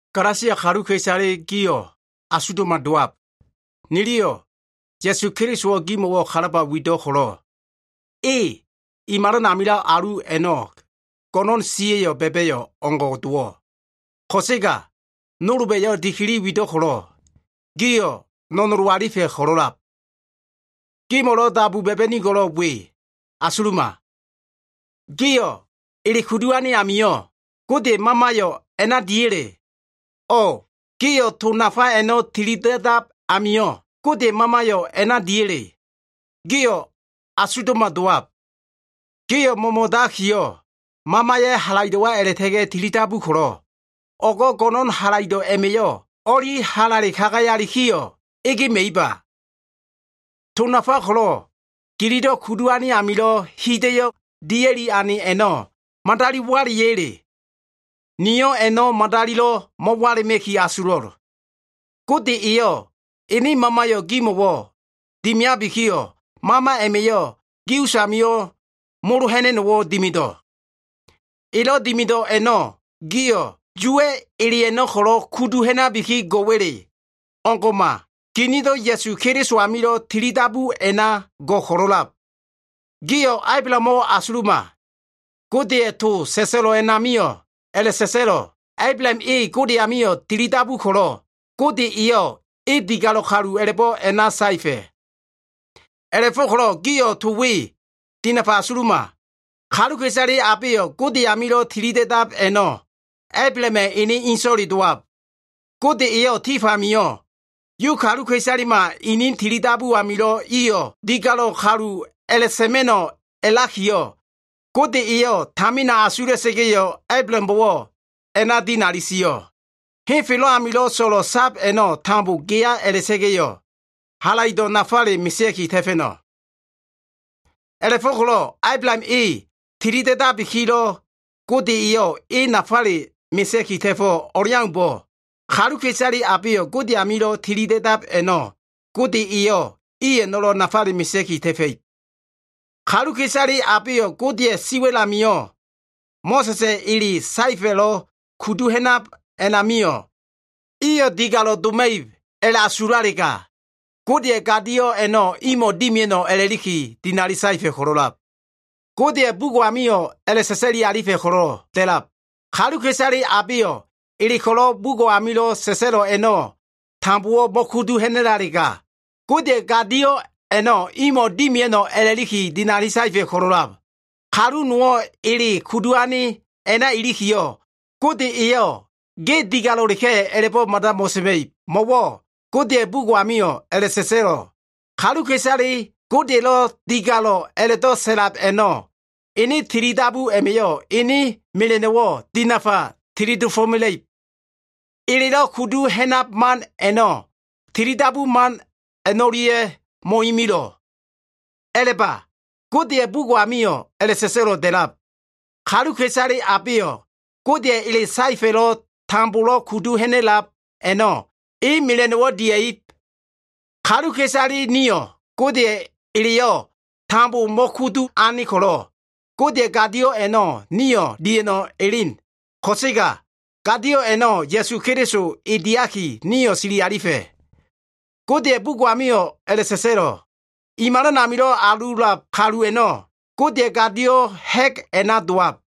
Galasia kaluka꞉isale gio꞉ asugdo꞉ma dowab! Niliyo꞉ Ya꞉su Kelisowo꞉ gimo꞉wo꞉ kalaba wido꞉ ko꞉lo꞉, e i malan amilo꞉ alu a꞉no꞉ go꞉no꞉n siya꞉lo꞉ ba꞉ba꞉yo꞉ o꞉ngo꞉ dowo꞉. Ko꞉sega nolba꞉yo꞉ dikili wido꞉ ko꞉lo꞉, gio꞉ no꞉nolo alifa꞉ ko꞉lo꞉lab. Gimo꞉lo꞉ dabu ba꞉ba꞉nigo꞉l we asuluma. Gio꞉ ele kudu ane ami Godeya꞉ Mamayo꞉ a꞉na diya꞉le? O꞉ gio꞉ to nafa a꞉no꞉ tilida꞉dab ami Godeya꞉ Mamayo꞉ a꞉na diya꞉le? Gio꞉ asugdo꞉ma dowab. Gio꞉ mo꞉mo꞉dakiyo꞉, Mamaya꞉ halaido꞉wa a꞉la꞉ta꞉ga꞉ tilidabu ko꞉lo꞉, o꞉go꞉ go꞉no꞉n halaido꞉ a꞉ma꞉yo꞉ o꞉li halale kagayalikiyo꞉ egema꞉iba? To nafa ko꞉lo꞉ gililo꞉ kudu ane amilo꞉ hida꞉yo꞉ dia꞉li ane a꞉no꞉ madali wala꞉ya꞉le? Niyo꞉ a꞉no꞉ madalilo꞉ mo꞉wala꞉ma꞉ki asulo꞉l. Gode eyo꞉ ene Mamayo꞉ gimo꞉wo꞉ dimiabikiyo꞉, Mama a꞉ma꞉yo꞉ gi usamio꞉ molo ha꞉na꞉no꞉wo꞉ dimido꞉. Elo꞉ dimido꞉ a꞉no꞉, giyo꞉ Yuwa꞉ ele a꞉no꞉ ko꞉lo꞉ kudu ha꞉nabiki go꞉wa꞉le? O꞉ngo꞉ma. Ginido꞉ Ya꞉su Keliso amilo꞉ tilidabu a꞉na go꞉ ko꞉lo꞉lab. Gio꞉ Ablahamo꞉ asuluma. Godeya꞉ to sa꞉sa꞉lo꞉ a꞉namio꞉ a꞉la꞉sio꞉, “Ablaham e Gode amio꞉ tilidabu ko꞉lo꞉, Gode eyo꞉ e digalo꞉ kalu a꞉la꞉bo꞉ a꞉na sio꞉.” A꞉la꞉fo꞉ko꞉lo꞉ gio꞉ to we dinafa asuluma. Kaluka꞉isale abeyo꞉ Gode amilo꞉ tilida꞉dab a꞉no꞉, Ablahama꞉ ene inso꞉le dowab. Gode eyo꞉ tif amio꞉ Yu kaluka꞉isalema ini tilidabu amio꞉ iyo꞉ digalo꞉ kalu a꞉la꞉sa꞉ma꞉no꞉ a꞉lakiyo꞉, Gode eyo꞉ tamina asula꞉sa꞉ga꞉yo꞉, Ablahambo꞉wo꞉ a꞉la꞉dinali sio꞉, “Henfelo꞉ amilo꞉ so꞉lo꞉ sab a꞉no꞉ tambo geya a꞉la꞉ta꞉ga꞉yo꞉, halaido꞉ nafale mesea꞉ki ta꞉fa꞉no꞉.” A꞉la꞉fo꞉ko꞉lo꞉ Ablaham e tilida꞉dabikilo꞉ Gode eyo꞉ e nafale mesea꞉ki ta꞉fo꞉ o꞉leaumbo꞉, kaluka꞉isale abeyo꞉ Gode amilo꞉ tilida꞉dab a꞉no꞉ Gode eyo꞉ i a꞉no꞉lo꞉ nafale mesea꞉ki ta꞉fa꞉ib. Kaluka꞉isale abeyo꞉, Godeya꞉ si wa꞉l amio꞉ Mo꞉sa꞉sa꞉ ele saefa꞉lo꞉ kudu ha꞉nab a꞉namio꞉, iyo꞉ digalo꞉ doma꞉ib a꞉la꞉asulalega, Godeya꞉ gadio꞉ a꞉no꞉ imo꞉ dimia꞉no꞉ a꞉la꞉liki dinali saefa꞉ ko꞉lo꞉lab. Godeya꞉ bugo꞉ amio꞉ a꞉la꞉sa꞉sa꞉li alifa꞉ ko꞉lo꞉ da꞉lab, “Kaluka꞉isale abeyo꞉ ele ko꞉lo꞉ bugo꞉ amilo꞉ sa꞉sa꞉lo꞉ a꞉no꞉ tambowo꞉ mo꞉kudu ha꞉na꞉lalega, Godeya꞉ gadio꞉ a꞉no꞉ imo꞉ dimia꞉no꞉ a꞉la꞉liki dinali saefa꞉ ko꞉lo꞉lab.” Kalu nowo꞉ ele kudu ane a꞉na ilikiyo꞉, Gode eyo꞉ ge digalo꞉leka꞉ a꞉la꞉bo꞉ mada mo꞉sa꞉ma꞉ib. Mo꞉wo꞉ Godeya꞉ bugo꞉ amio꞉ a꞉la꞉sa꞉sa꞉lo꞉, “Kaluka꞉isale Godeya꞉lo꞉ digalo꞉ a꞉la꞉do꞉ sa꞉lab a꞉no꞉, ene tilidabu a꞉ma꞉yo꞉ ene mela꞉no꞉wo꞉ dinafa tili dofo꞉mela꞉ib.” Elelo꞉ kudu ha꞉nan man a꞉no꞉ tilidabu man a꞉no꞉lia꞉yo꞉ mo꞉imilo꞉. A꞉la꞉ba, Godeya꞉ bugo꞉ amio꞉ a꞉la꞉sa꞉sa꞉lo꞉ da꞉lab, “Kaluka꞉isale abeyo꞉ Godeya꞉ ele saefa꞉lo꞉ tambolo꞉ kudu ha꞉na꞉lab a꞉no꞉ e mela꞉no꞉wo꞉ dia꞉ib.” Kaluka꞉isale nio꞉ Godeya꞉ eleyo꞉ tambo mo꞉kudu ane ko꞉lo꞉, Godeya꞉ gadio꞉ a꞉no꞉ nio꞉ dia꞉no꞉ elen ko꞉sega, gadio꞉ a꞉no꞉ Ya꞉su Keliso e diaki, nio꞉ sili alifa꞉. Godeya꞉ bugo꞉ amio꞉ a꞉la꞉sa꞉sa꞉lo꞉, “I malan amilo꞉ alulab kalu a꞉no꞉ Godeya꞉ gadio꞉ ha꞉g a꞉na dowab.”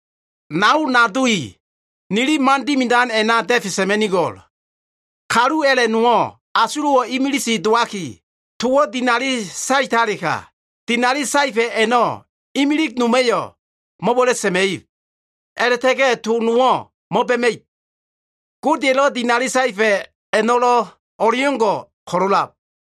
Nao nado i, nili man dimidan a꞉na da꞉fe sa꞉ma꞉nigo꞉l. Kalu a꞉la꞉ nowo꞉ asulo꞉ imilig dowaki, towo꞉ dinali saetalega, dinali saefa꞉ a꞉no꞉ imilig noma꞉yo꞉ mo꞉wa꞉la꞉ sa꞉ma꞉ib, a꞉la꞉ta꞉ga꞉ to nowo꞉ mo꞉ba꞉ma꞉ib. Godeya꞉lo꞉ dinali saefa꞉ a꞉no꞉lo꞉ o꞉leo꞉ngo꞉ ko꞉lo꞉lab.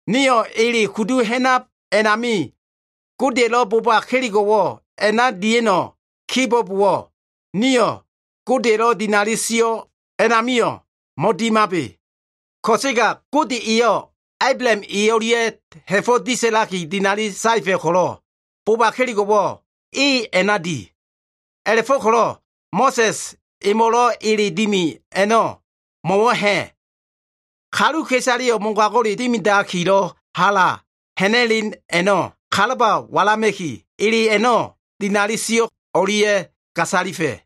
Nio꞉ ele kudu ha꞉nab a꞉nami Godeya꞉lo꞉ boba kelego꞉wo꞉ a꞉na dia꞉no꞉ kibo꞉bowo꞉, nio꞉ Godeya꞉lo꞉ dinali sio꞉ a꞉namio꞉ mo꞉dimabe. Ko꞉sega Gode eyo꞉ Ablaham e o꞉lia꞉yo꞉ ha꞉fo꞉wo꞉ disa꞉laki dinali saefa꞉ ko꞉lo꞉, boba kelego꞉wo꞉ e a꞉na di. A꞉la꞉fo꞉ko꞉lo꞉ Mo꞉sa꞉s emo꞉lo꞉ ele dimi a꞉no꞉ mo꞉wo꞉ ha꞉? Kaluka꞉isaleyo꞉ mogago꞉ dimidakilo꞉ hala ha꞉na꞉len a꞉no꞉ kalaba walama꞉ki, ele a꞉no꞉ dinali sio꞉ o꞉lia꞉ gasalifa꞉.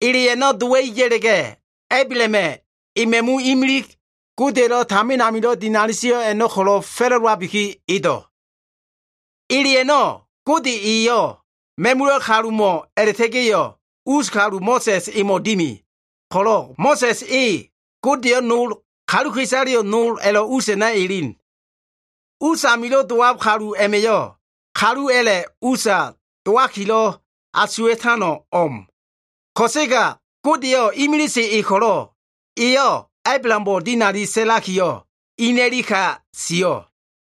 Ele a꞉no꞉ dowa꞉i ya꞉la꞉ga꞉, Ablahama꞉ e ma꞉mu imilig, Godeya꞉lo꞉ tamin amilo꞉ dinali sio꞉ a꞉no꞉ ko꞉lo꞉ fa꞉la꞉dowabiki edo꞉. Ele a꞉no꞉ Gode eyo꞉ ma꞉mula꞉ kalumo꞉ a꞉la꞉ta꞉ga꞉yo꞉ us kalu Mo꞉sa꞉s emo꞉ dimi, ko꞉lo꞉ Mo꞉sa꞉s e Godeyo꞉ nol, kaluka꞉isaleyo꞉ nol, a꞉lo꞉ usa elen. Usamilo꞉ dowab kalu a꞉ma꞉yo꞉, kalu a꞉la꞉ usa dowakilo꞉ asuwa꞉tano꞉ o꞉m. Ko꞉sega Godeyo꞉ imilise e ko꞉lo꞉, eyo꞉ Ablahambo꞉ dinali sa꞉lakiyo꞉, ene ka sio꞉.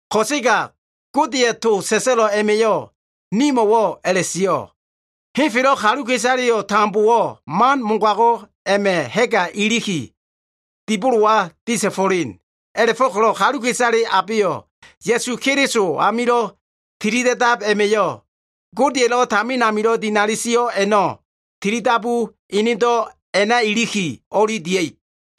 Ko꞉sega Godeya꞉ to sa꞉sa꞉lo꞉ a꞉ma꞉yo꞉ nimo꞉wo꞉ a꞉la꞉sio꞉, “Henfelo꞉ kaluka꞉isale tambowo꞉ man mogago꞉ a꞉ma꞉ ha꞉ga iliki, dibolowa disa꞉fo꞉len.” A꞉la꞉fo꞉ko꞉lo꞉ kaluka꞉isale abeyo꞉ Ya꞉su Keliso amilo꞉ tilida꞉dab a꞉ma꞉yo꞉, Godeya꞉lo꞉ tamin amilo꞉ dinali sio꞉ a꞉no꞉ tilidabu enedo꞉ a꞉na ilikiyo꞉, o꞉li dia꞉ib.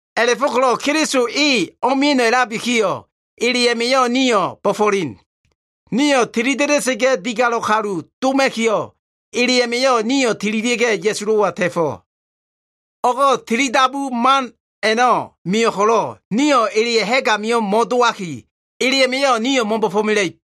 A꞉la꞉fo꞉ko꞉lo꞉ Keliso e o꞉mia꞉no꞉ a꞉labikiyo꞉, ele a꞉ma꞉yo꞉ nio꞉ bo꞉fo꞉len. Nio꞉ tilida꞉da꞉sa꞉ga꞉ digalo꞉ kalu doma꞉kiyo꞉, ele a꞉ma꞉yo꞉ nio꞉ tililia꞉ga꞉ Ya꞉sulo꞉wa ta꞉fo꞉. O꞉go꞉ tilidabu man a꞉no꞉ mio꞉ ko꞉lo꞉, nio꞉ eleya꞉ ha꞉g amio꞉ mo꞉doma꞉no꞉. Ele a꞉ma꞉yo꞉ nio꞉ mo꞉bo꞉fo꞉mela꞉ib.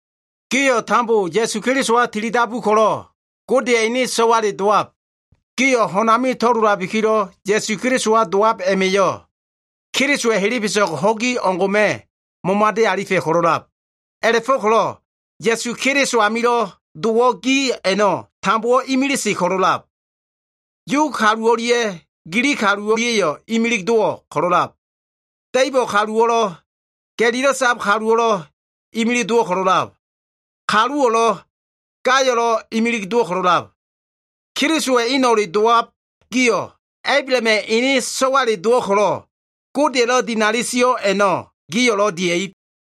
Gio꞉ tambo Ya꞉su Kelisowa tilidabu ko꞉lo꞉, Godeya꞉ ene so꞉wale dowab. Gio꞉ ho꞉n ami to꞉lolabikilo꞉ Ya꞉su Kelisowa dowab a꞉ma꞉yo꞉, Kelisowa꞉ helebeso꞉g ho꞉gi o꞉ngo꞉ma꞉ momade alifa꞉ ko꞉lo꞉lab. A꞉la꞉fo꞉ko꞉lo꞉ Ya꞉su Keliso amilo꞉ dowo꞉ gi a꞉no꞉, tambowo꞉ imilise ko꞉lo꞉ a꞉lab. Yu kalu o꞉lia꞉ Gilig kalu o꞉lia꞉yo꞉ imilig dowo꞉ ko꞉lo꞉lab. Da꞉ibo꞉ kaluwo꞉lo꞉, ga꞉lilo꞉ sab kaluwo꞉lo꞉ imilig dowo꞉ ko꞉lo꞉lab. Kaluwo꞉lo꞉, gayo꞉lo꞉ imilig dowo꞉ ko꞉lo꞉lab. Kelisowa꞉ eno꞉le dowab gio꞉, Ablahama꞉ ene so꞉wale dowo꞉ ko꞉lo꞉, Godeya꞉lo꞉ dinali sio꞉ a꞉no꞉ gio꞉lo꞉ dia꞉ib.